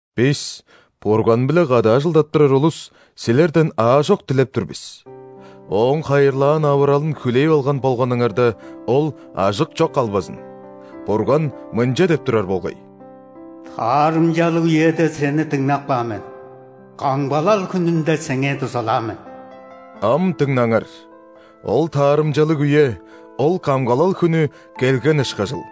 Бис, Бурган-биле кады ажылдап турар улус, силерден аажок дилеп тур бис: Ооң хайырлаан авыралын хүлээп алган болганыңарда, ол ажык чок калбазын! Бурган мынча деп турар болгай:«Таарымчалыг үеде сени дыңнап каан мен;камгалал хүнүнде сеңээ дузалаан мен». Ам дыңнаңар: ол таарымчалыг үе, ол камгалал хүнү келген ышкажыл!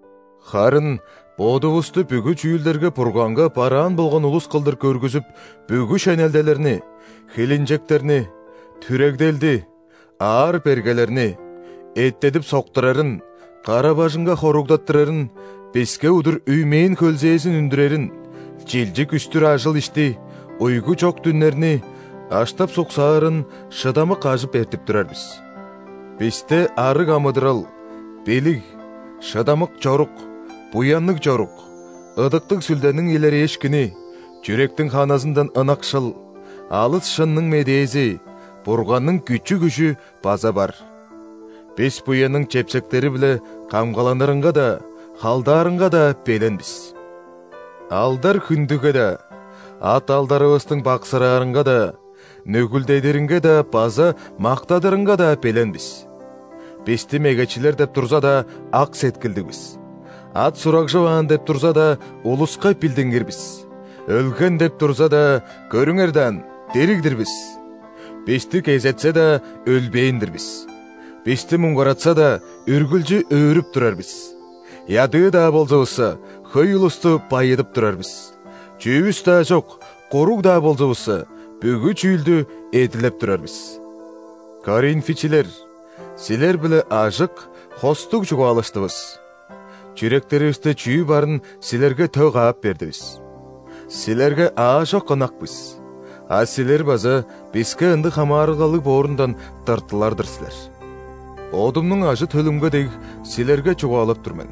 Харын бодувусту бүгү чүүлдерге Бурганга бараан болган улус кылдыр көргүзүп, бүгү шенелделерни: хилинчектерни, түрегделди, аар-бергелерни, эттедип-соктурарын, кара-бажыңга хоругдаттырарын, биске удур үймээн-хөлзээзин үндүрерин, чилчик үстүр ажыл-ишти, уйгу чок дүннерни, аштап-суксаарын шыдамык ажып эртип турар бис. Бисте арыг амыдырал, билиг, шыдамык чорук, буянныг чорук, Ыдыктыг Сүлдениң илерээшкини, чүректиң ханызындан ынакшыл, алыс шынның Медээзи, Бурганның күчү-күжү база бар. Бис буянның чепсектери-биле камгаланырынга-даа, халдаарынга-даа белен бис. Алдар-хүндүге-даа, ат-алдарывыстың баксыраарынга-даа, нүгүлдедиринге-даа база мактадырынга-даа белен бис. Бисти мегечилер деп турза-даа, ак сеткилдиг бис. Ат-сурагжываан деп турза-даа, улуска билдингир бис. Өлген деп турза-даа, көрүңер даан – дириг-дир бис! Бисти кезетсе-даа, өлбээн-дир бис. Бисти муңгаратсаза-даа, үргүлчү өөрүп турар бис. Ядыы-даа болзувусса, хөй улусту байыдып турар бис. Чүвүс-даа чок, куруг-даа болзувусса, бүгү чүүлдү эдилеп турар бис. Коринфичилер, силер-биле ажык, хостуг чугаалаштывыс. Чүректеривисте чүү барын силерге тө каап бердивис. Силерге аажок ынак бис, а силер база биске ындыг хамаарылгалыг боорундан тыртылар-дыр силер. Бодумнуң ажы-төлүмге дег, силерге чугаалап тур мен: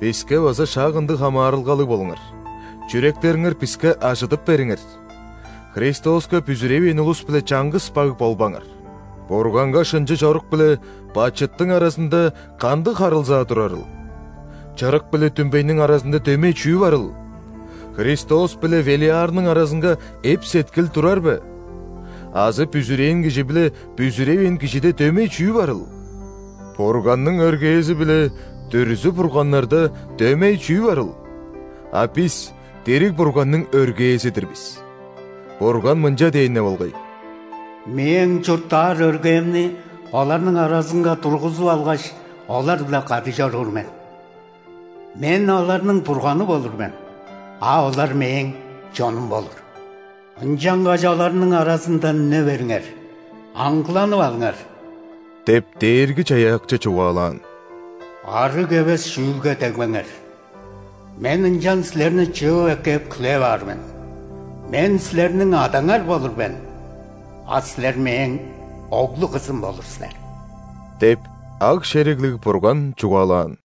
биске база шак ындыг хамаарылгалыг болуңар, чүректериңер биске ажыдып бериңер! Христоска бүзүревээн улус-биле чаңгыс баг болбаңар. Бурганга шынчы чорук биле бачыттың аразында кандыг харылзаа турарыл? Чырык биле дүмбейниң аразында дөмей чүү барыл? Христос биле Велиарның аразынга эп-сеткил турар бе? Азы бүзүрээн кижи биле бүзүревээн кижиде дөмей чүү барыл? Бурганның өргээзи биле дүрзү-бурганнарда дөмей чүү барыл? А бис – дириг Бурганның өргээзи-дир бис. Бурган мынча дээн-не болгай:«Мээң чурттаар өргээмни оларның аразынга тургузуп алгаш,олар-биле кады чоруур мен.Мен оларның Бурганы болур мен,а олар Мээң чонум болур». «Ынчангаш оларның аразындан үне бериңер,аңгыланып алыңар – деп, Дээрги-Чаяакчы чугаалаан,– ·арыг эвес чүүлге дегбеңер,Мен ынчан силерни чыып эккеп, хүлээп аар мен». «Мен силерниң Адаңар болур мен,а силер мээң оглу-кызым болур силер» –деп, Аг-шериглиг Бурган чугаалаан.